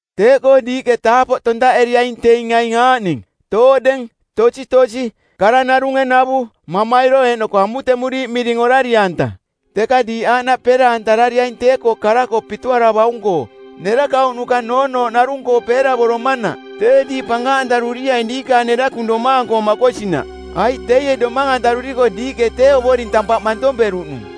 Teeꞌkoo diiꞌke taapoꞌ tontaꞌeriaing teing aing aaꞌning: tooꞌdeng, tositosi, kara narunge navu, mamairo eeꞌnoko amutemuriiꞌ miring orari-anta. Teka diiꞌ aaꞌnaꞌ peera-antarariaing tee-koo kara-koo pituaravaung-koo nerakauꞌnuka noonooꞌkoo narung-koo peeravoromanaꞌ, tee diiꞌ pankaꞌantaruriaing diikaang nerakung domaang-koo makosinaꞌ. Aiꞌ teie domang-antaruriko diiꞌke tee Ovoring tampaꞌ mantomperuꞌnung.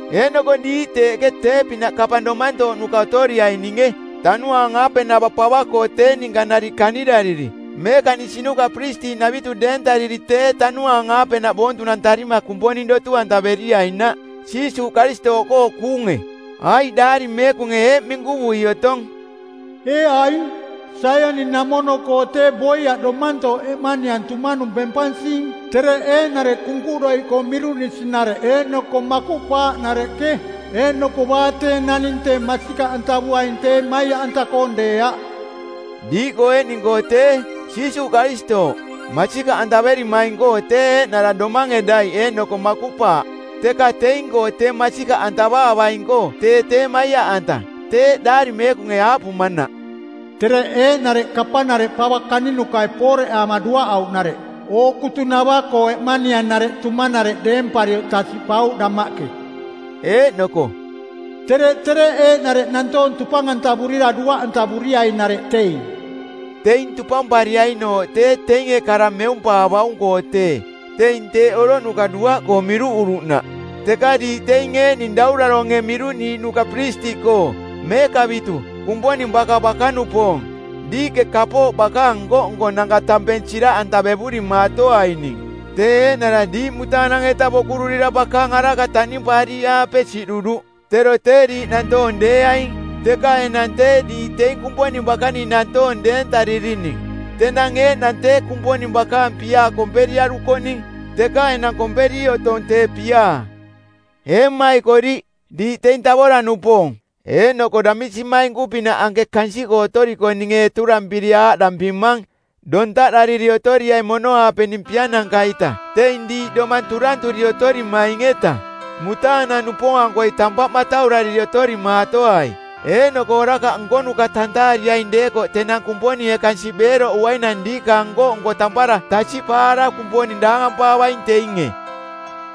Eeꞌnoko diiꞌ teeꞌke tee-pinaꞌ kapang domantooꞌnuka otoriaininge tanuaang-aapenava pava-koo tee ninka nariꞌ kanirariri meekaꞌnisinuka piristiꞌnavitu deentariri teeꞌ tanuaang-aapenaꞌ boontunantarima Kumponing dotu-antaveriainaꞌ Jiisuuꞌ Karistooꞌkoo kuunge. Aiꞌ Daari Meekunge eeꞌ minkuvui otong, “Ee aing, Saioni-namono-koo tee boiaꞌ domantooꞌ eꞌmaniang tumanung bempansing, tereꞌ eeꞌnareꞌ kunkuꞌdoiꞌkoo miruꞌnisi-nareꞌ eeꞌnoko makuꞌpaaꞌnareꞌke, eeꞌnoko baa tee naning tee masikaꞌantavuaing tee maiaꞌanta-koong deeaꞌ.” Diiꞌkoo eeꞌning-koo tee, Jiisuuꞌ Karistooꞌ, masikaꞌantaverimaing-koo tee eeꞌnara domange daiꞌ eeꞌnoko makuꞌpaaꞌ, teka teing-koo tee masikaꞌantavaavaing-koo tee tee maiaꞌanta, teeꞌ Daari Meekunge aaꞌpumanaꞌ, “Tereꞌ eeꞌnareꞌ kapanareꞌ pava kaninukai pooreꞌaama duaꞌauꞌnareꞌ ookutunava-koo eꞌmanianareꞌ tumanareꞌ deemparioꞌ tasiꞌpauꞌ damaꞌke.” Eeꞌnoko “Tereꞌ tereꞌ eeꞌnareꞌ nantoong tupang-antavurira duaꞌantavuriainareꞌ teing.” Teing tupampariainooꞌ tee teinge kara meumpaavaung-koo teeꞌ, teing teeꞌ oroꞌnuka duaꞌkoo miruꞌuruꞌnaꞌ. Teka diiꞌ teing eeꞌning Dauraronge˜ miruꞌniiꞌnuka piristiꞌkoo, meekavitu, Kumponing baka bakanupoong, diiꞌke kapooꞌ bakaang nko-nkonanka tampeng siraꞌantaevurimatoaining, tee eeꞌnara diiꞌ mutaanang-eta bokururira bakaang araka taꞌnimpaariiꞌaape siꞌduruꞌ. Tero tee diiꞌ nantoong deeaing, teka enang tee diiꞌ teing Kumponing bakaning nantoong deentaririning. Tenang eeꞌnang tee Kumponing bakaang piaa komperiarukoꞌning, teka enang komperi otong tee piaa. Ee mmaikoriꞌ, diiꞌ teing tavora-nupoong eeꞌnoko damisimainku-pinaꞌ anke kansiꞌkoo otoriko ninge eturampiri aaꞌdampimang: Dontaꞌdariri otoriai mono-aapening piananka-ita teing diiꞌ domang turanturi otorimaing-eta. Mutaanang-nupoong-ankoi tampaꞌ mataurariri otorimaatoai eeꞌnoko orakaꞌ nkonuka tantaariaing deekoꞌ tenang Kumponinge kansiꞌ beeroꞌuainang diikaang nko-nko tampara tasiꞌpaara Kumponing daangampaavaing teinge.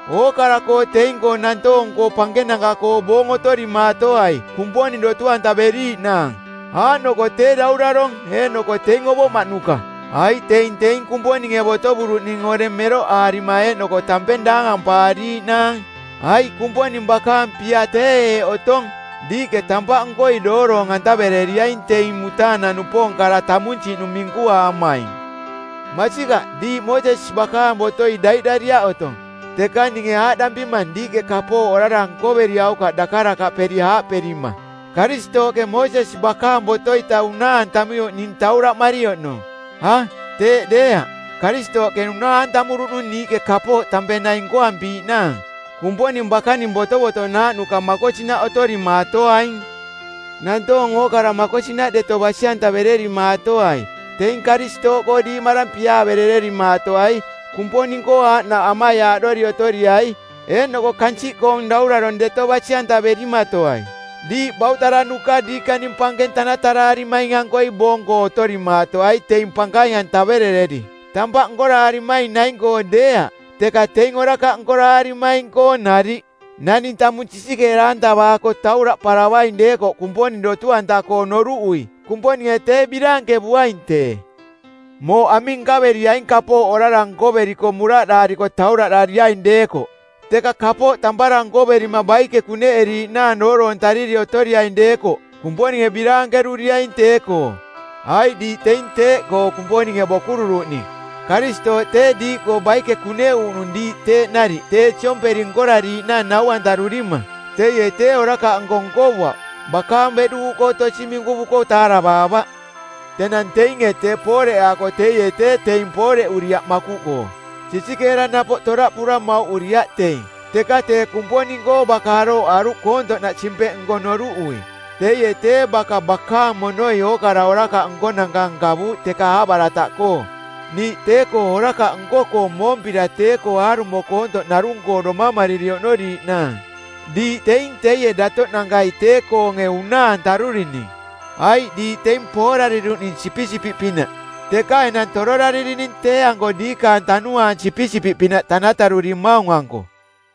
Ookara-koo teing-koo nantoong-koo pankenanka-koo boong otorimaatoai Kumponing dotu-antaveriiꞌnaang, aaꞌnoko tee daurarong, eeꞌnoko teing ovoꞌmaꞌnuka, aiꞌ teing teing Kumponinge botovuruꞌning oreng meroꞌaarima eeꞌnoko tampeng daangampaariiꞌnaang. Aiꞌ Kumponing bakaang pia tee eeꞌ otongꞌ: Diiꞌke tampaꞌnkoi dooroong-antavereriaing teing mutaanang-nupoong kara tamunsiꞌnung minkuaamaing. Masikaꞌ diiꞌ Moosesi bakaang botoi daiꞌdariaꞌ otong, teka ninge aaꞌdampimang diiꞌke kapooꞌ orara nkoveriaukaꞌ dakarakaꞌperi aaꞌperima, “Karistooꞌke Moosesi bakaang boto-ita unaa-antamuioꞌ ning tauraꞌmari oꞌnong.” A, teeꞌ deeaꞌ. Karistooꞌke unaa-antamuruꞌnung niiꞌke kapooꞌ tampeng naing nkoampiiꞌnaang. Kumponing bakaning botovotonaaꞌnuka makosinaꞌ otorimaatoaing. Nantoong ookara makosinaꞌ deto basi-antavererimaatoai. Teing Karistooꞌkoo diiꞌmarang piaaverererimaatoai. Kumponing-koo aaꞌnaꞌ amaiaaꞌdori otoriai, eeꞌnoko kansiꞌkoong daurarong deto basi-antaverimatoai. Diiꞌ bautaranuka diikaning pankeng tanataraarimaing-ankoi boong-koo otorimaatoai teing pankaing-antaverereri, tampaꞌ nkoraarimaing naing-koo deeaꞌ, teka teing orakaꞌ nkoraarimaing-koo nariꞌ. Naning tamung sisikeera-antavaako tauraꞌparavaing deekoꞌ Kumponing dotu-anta-koo noruꞌui, Kumponinge tee biraankevuaing tee. Mooꞌ aming nkaveriaing kapooꞌ orara nkoveriko muraꞌdaariko tauraꞌdariaing deekoꞌ? Teka kapooꞌ tampara nkoverima baike kuneꞌeriiꞌnaang dooroontariri otoriaing deekoꞌ Kumponinge biraankeruriaing tee-koo. Aiꞌ diiꞌ teing teeꞌkoo Kumponinge bokururuꞌning. Karistooꞌ tee diiꞌkoo baike kuneꞌuuꞌnung diiꞌ teeꞌ nariꞌ tee siomperi nkorariiꞌnaang nau-antarurima. Teie tee orakaꞌnko nkovuaꞌ, bakaang beꞌduuꞌkoo tosi minkuvuko taaravaavaꞌ. Tenang teinge tee pooreꞌaako teie tee teing pooreꞌuriaꞌ makuꞌkoo. Sisikeera napoꞌ toraꞌpura mauꞌuriaꞌ teing, teka tee Kumponing-koo baka arooꞌaruꞌ koontoꞌnaꞌ simpeꞌnko˜ noruꞌui. Teie tee baka bakaang monoi ookara orakaꞌ nkonanka nkavuuꞌ teka aaꞌbarataꞌkoo, niiꞌ tee-koo orakaꞌ nko-koo moompira tee-koo aarumo koontoꞌ narung-koo domamariri oꞌnoriiꞌnaang. Diiꞌ teing teie datoꞌnankai tee-koonge unaa-antarurining. Aiꞌ diiꞌ teing poorariruꞌning sipisipiꞌpinaꞌ, teka enang tororaririning tee-anko diikaang tanuaang sipisipiꞌpinaꞌ tanatarurimaung-anko.